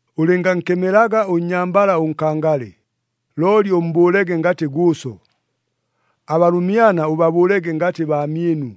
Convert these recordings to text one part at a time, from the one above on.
Ʉlɨngankemelaga ʉnnyambala ʉnkangale, looli ʉmmbʉʉlege ngatɨ gʉʉso. Abalʉmyana ʉbabʉʉlege ngatɨ baamyɨnu,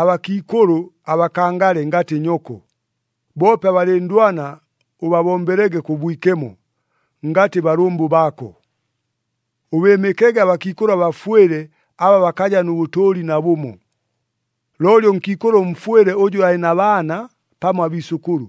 abakiikʉlʉ abakangale ngatɨ nyoko, boope abalɨndwana ʉbabombelege kʉ bwikemo, ngatɨ balʉmbʉ baako. Ʉbɨɨmɨkege abakiikʉlʉ abafwɨle aba bakaja nʉ bʉtʉʉli nabʉmo. Looli ʉnkiikʉlʉ ʉmfwɨle ʉjʉ alɨ na baana pamo abiisʉkʉlʉ,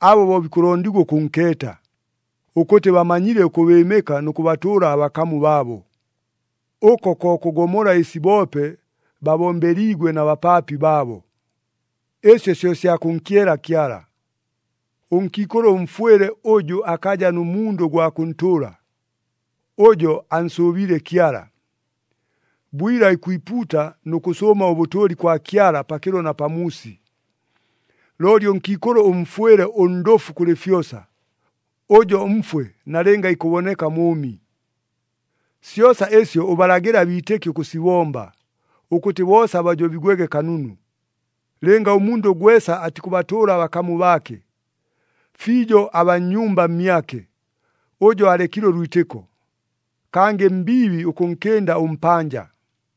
abo bo bikʉlondigwa ʉkʉnkeeta, ʉkʉtɨ bamanyile ʉkʉbɨɨmɨka nʉ kʉbatʉʉla abakamu baabo. Ʉko ko kʉgomola ɨsi boope babombeliigwe na bapaapi baabo. Ɨsyo syo sya kʉnkyela Kyala. Ʉnkiikʉlʉ ʉmfwɨle ʉjʉ akaja nʉ mundʉ gwa kʉntʉʉla, ʉjo ansʉʉbiile Kyala, bwila ikwipuuta nʉ kʉsʉʉma ʉbʉtʉʉli kwa Kyala pakɨlo na pamuusi. Looli ʉnkiikʉlʉ ʉmfwɨle ʉndʉfu kʉlɨ fyosa, ʉjo mfwe nalɨnga ikʉboneka mʉʉmi. Syosa ɨsyo ʉbalagɨle abiitɨki ʉkʉsibomba, ʉkʉtɨ boosa bajobigwege kanunu. Lɨnga ʉmundʉ gwesa atikʉbatʉʉla abakamu baake, fiijo abaa nnyumba mmyake, ʉjo alekile ʉlwitɨko, kangɨ mbiibi ʉkʉnkɨnda ʉmpanja.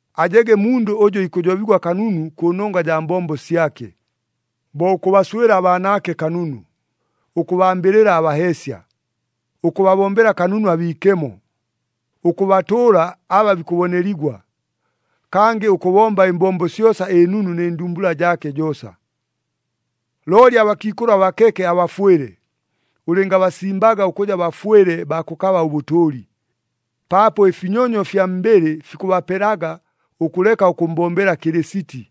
Ajege mundʉ ʉjʉ ikʉjobigwa kanunu kʉnongwa jaa mbombo syake, bo ʉkʉbaswɨla abaanaake kanunu, ʉkʉbambɨlɨla abaheesya, ʉkʉbabombela kanunu abiikemo, ʉkʉbatʉʉla aba bikʉboneligwa, kangɨ ʉkʉbomba ɨmbombo syosa ɨnunu nɨ ndumbula jaake joosa. Looli abakiikʉlʉ abakeke abafwɨle, ʉlɨngabasimbaga ʉkʉja bafwɨle baa kʉkaba ʉbʉtʉʉli, paapo ɨfinyonyo fya mbɨlɨ fikʉbapelaga ʉkʉleka ʉkʉmmbombela Kɨlɨsiti,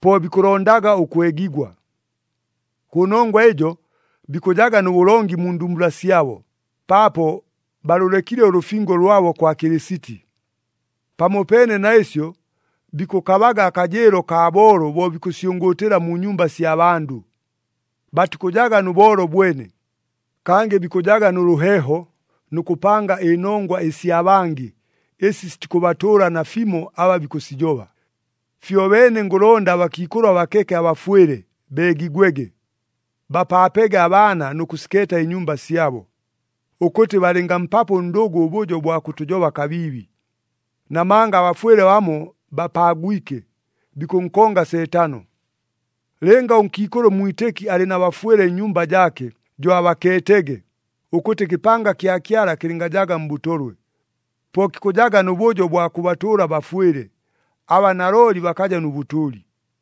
po bikʉlondaga ʉkwegigwa. Kʉnongwa ɨjo bikʉjaga nʉ bʉlongi mu ndumbula syabo, paapo balʉlekile ʉlʉfingo lwabo kwa Kɨlɨsiti. Pamopeene na ɨsyo, bikʉkabaga akajɨɨlo akaa boolo bo bikʉsyʉngʉʉtɨla mu nyumba sya bandʉ. Batikʉjaga nʉ boolo bwene, kangɨ bikʉjaga nʉ lʉheeho nʉ kʉpanga ɨnongwa ɨsya bangɨ ɨsi sitikʉbatʉʉla nafimo aba bikʉsijoba. Fyobeene ngʉlonda abakiikʉlʉ abakeke abafwɨle beegigwege, bapaapege abaana nʉ kʉsikeeta ɨnyumba syabo, ʉkʉtɨ balɨngampapo ʉndʉgʉ ʉbʉjo bwa kʉtʉjoba kabiibi. Namanga abafwɨle bamo bapaagwike, bikʉnkonga Seetano. Lɨnga ʉnkiikʉlʉ ʉmwitɨki alɨ na bafwɨle nnyumba jaake, jo abakeetege, ʉkʉtɨ ɨkɨpanga kya Kyala kɨlɨngajaga mbʉtolwe. Po kikʉjaga nʉ bʉjo bwa kʉbatʉʉla abafwɨle, aba nalooli bakaja nʉ bʉtʉʉli.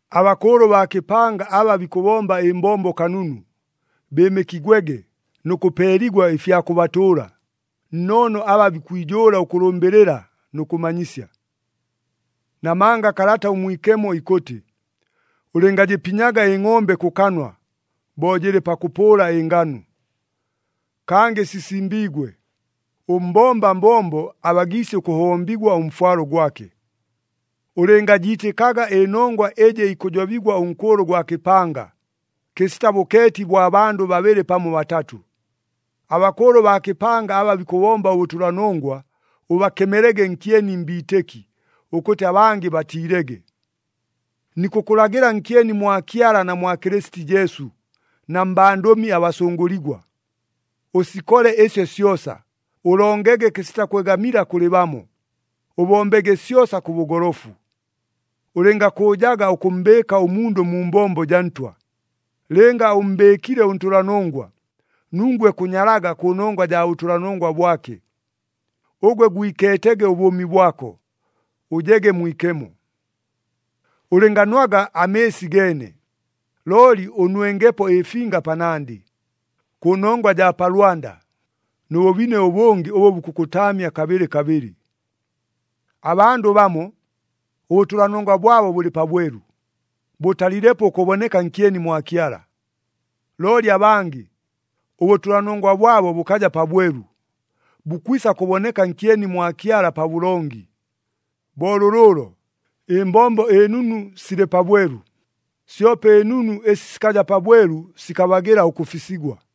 Abakʉʉlʉ baa kɨpanga aba bikʉbomba ɨmbombo kanunu, bɨɨmɨkigwege nʉ kʉpeeligwa ɨfya kʉbatʉʉla, nnoono aba bikwijʉʉla ʉkʉlʉmbɨlɨla nʉ kʉmanyisya. Namanga Kalata ʉMwikemo ikʉtɨ, “Ʉlɨngajɨpinyaga ɨngʼombe kʉ kanwa, bo jɨlɨ pakʉpʉʉla ɨnganu.” Kangɨ sisimbiigwe, “Ʉmbomba mbombo abagiisye ʉkʉhombigwa ʉmfwalo gwake.” Ʉlɨngajiitɨkaga ɨnongwa ɨjɨ ikʉjobigwa ʉnkʉʉlʉ gwa kɨpanga, kɨsita bʉkeeti bwa bandʉ babɨlɨ pamo batatʉ. Abakʉʉlʉ baa kɨpanga aba bikʉbomba ʉbʉtʉlanongwa, ʉbakemelege nkyeni mbiitɨki, ʉkʉtɨ abangɨ batiilege. Nikʉkʉlagɨla nkyeni mwa Kyala na mwa Kɨlɨsiti Jesu na mbandʉmi abasʉngʉligwa. Ʉsikole ɨsyo syosa, ʉlongege kɨsita kwegamila kʉlɨ bamo, ʉbombege syosa kʉ bʉgolofu. Ʉlɨngakʉʉjaga ʉkʉmmbɨɨka ʉmundʉ mu mbombo jaa Ntwa, lɨnga ʉmmbɨɨkile ʉntʉlanongwa, nungwe kʉnyalaga kʉnongwa jaa bʉtʉlanongwa bwake. Ʉgwe gwikeetege ʉbʉʉmi bwako, ʉjege mwikemo. Ʉlɨnganwaga amɨɨsi geene, looli ʉnwengepo ɨfinga panandɨ, kʉnongwa jaa pa lwanda nʉ bʉbine ʉbʉngɨ ʉbʉ bukʉkʉtaamya kabɨlɨ kabɨlɨ. Abandʉ bamo, ʉbʉtʉlanongwa bwabo bʉlɨ pabwelu, bʉtalilepo ʉkʉboneka nkyeni mwa Kyala. Looli abangɨ, ʉbʉtʉlanongwa bwabo bʉkaja pabwelu, bukwisa kʉboneka nkyeni mwa Kyala pabʉlongi. Bo lʉlʉʉlo, ɨmbombo ɨnunu silɨ pabwelu, syope ɨnunu ɨsi sikaja pabwelu sikabagɨla ʉkʉfisigwa.